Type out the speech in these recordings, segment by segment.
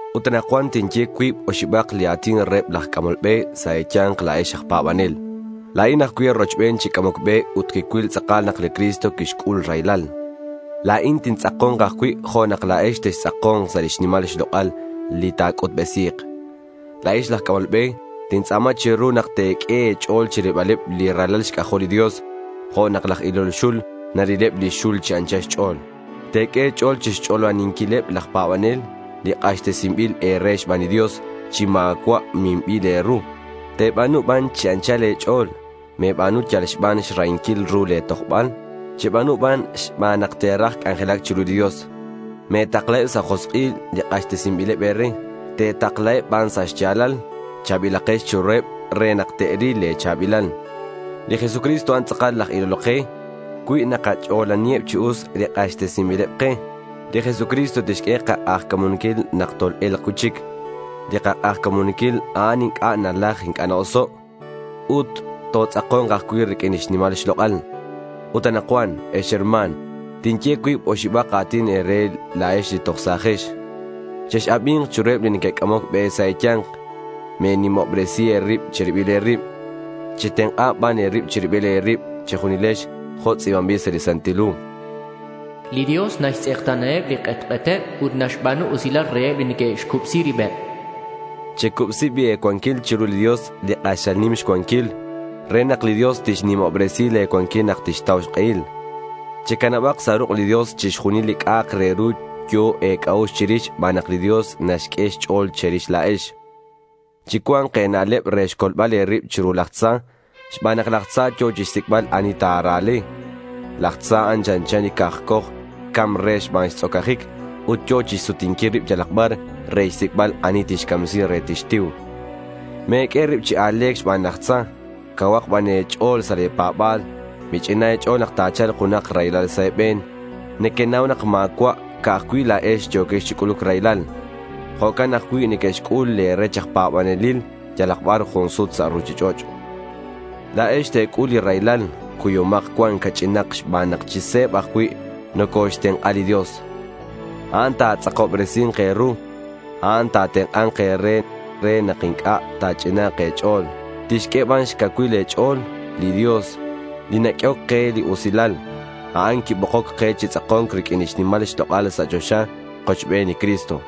Ut anakcuan tinye cuib oxibak li a̱tin reheb laj c'amol be sa' e̱ya̱nk la̱ex aj pa̱banel. La̱in ajcui' e̱rochben chi c'amoc be ut quicuil tz'akal nak li Cristo quixc'ul raylal. La̱in tintz'ako̱nk ajcui' jo' nak la̱ex textz'ako̱nk sa' lix nimal xlok'al li ta̱c'utbesi̱k. La̱ex laj c'amol be, tintz'a̱ma che̱ru nak te̱q'ue e̱ch'o̱l chirilbaleb li ralal xc'ajol li Dios jo' nak laj ilol xul narileb lix xul chi anchal xch'o̱l. Te̱q'ue e̱ch'o̱l chixch'olaninquileb laj pa̱banel li k'axtesinbil e̱re xban li Dios chi ma̱cua' minbil e̱ru. Te̱ba̱nu ban chi anchal e̱ch'o̱l. Me̱ba̱nu yal xban xrahinquil ru le̱ tojbal. Cheba̱nu ban xban nak te̱raj c'anjelac chiru li Dios. Me̱taklaheb sa' josk'il li k'axtesinbileb e̱re. Te̱taklaheb ban sa' xya̱lal. Cha̱bilakex chiruheb re nak te'ril le̱ cha̱bilal. Li Jesucristo a'an tz'akal laj ilol ke. Cui nakach'olaniheb chi us li k'axtesinbileb ke, li Jesucristo tixq'ue kak'ajca̱munquil nak tol-e̱lk cui'chic. Li kak'ajca̱munquil a'an inc'a' nalaj inc'a' na-oso'. Ut totz'ako̱nk ajcui' riq'uin lix nimal xlok'al. Ut anakcuan, ex herma̱n, tinye cuib oxibak a̱tin e̱re la̱ex li toj sa̱jex. Chex-abi̱nk chiruheb li neque'c'amoc be sa' e̱ya̱nk. Me̱nimobresi e̱rib che̱ribil e̱rib. Chetenk'a ban e̱rib che̱ribil e̱rib che̱junilex jo' tz'i̱banbil sa' li Santil Hu: Li Dios naxtz'ekta̱naheb li k'etk'eteb ut naxba̱nu usilal reheb li neque'xcubsi ribeb. Checubsi bi' e̱cuanquil chiru li Dios li k'axal nim xcuanquil re nak li Dios tixnimobresi le̱ cuanquil nak tixtau xk'ehil. Checanabak sa' ruk' li Dios chixjunil li c'a'ak re ru yo̱ e̱c'a'ux chirix xban nak li Dios naxq'ue xch'o̱l che̱rix la̱ex. Chicua̱nk e̱na'leb re xcolbal e̱rib chiru laj tza xban nak laj tza yo̱ chixsic'bal ani ta̱ra̱le. Laj tza a'an chanchan li cakcoj ca̱mc re xban xtz'ocajic ut yo̱ chixsutinquil rib yalak bar re xsic'bal ani tixcamsi re tixtiu. Me̱q'ue e̱rib chi a̱le̱c xban laj tza. Cauhak ban e̱ch'o̱l sa' le̱ pa̱ba̱l. Mich'inan e̱ch'o̱l nak ta̱cha̱lk junak raylal sa' e̱be̱n. Nequenau nak ma̱cua' ca'aj cui' la̱ex yo̱quex chi c'uluc raylal. Jo'can ajcui' neque'xc'ul le̱ rech aj pa̱banelil yalak bar jun sut sa' ruchich'och'. La̱ex te̱c'ul li raylal. Cuyomak cuan ca'ch'inak xban nak chi se̱b ajcui' nocoxtenk'a li Dios. A'an ta̱tz'akobresi̱nk e̱ru. A'an ta̱tenk'a̱nk e̱re re nak inc'a' ta̱ch'ina̱nk e̱ch'o̱l. Tixq'ue ban xcacuil e̱ch'o̱l. Li Dios, li naq'uehoc ke li usilal, a'an quibokoc ke chi tz'ako̱nc riq'uin lix nimal xlok'al sa' choxa kochben li Cristo.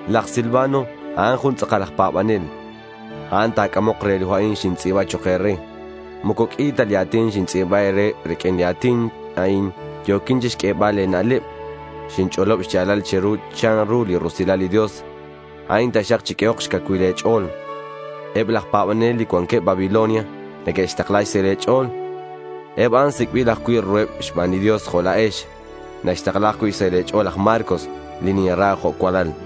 Laj Silvano, a'an jun tz'akal aj pa̱banel. A'an ta̱c'amok re li hu a'in xintz'i̱ba chok' e̱re. Moco q'ui ta li a̱tin xintz'i̱ba e̱re. Riq'uin li a̱tin a'in yo̱quin chixq'uebal e̱na'leb. Xinch'olob xya̱lal che̱ru chanru li rusilal li Dios. A'in taxak chiq'uehok xcacuil e̱ch'o̱l. Eb laj pa̱banel li cuanqueb Babilonia neque'xtakla xsahil e̱ch'o̱l. Eb a'an sic'bil ajcui' ruheb xban li Dios jo' la̱ex. Naxtakla ajcui' xsahil e̱ch'o̱l laj Marcos, li ninra jo' cualal.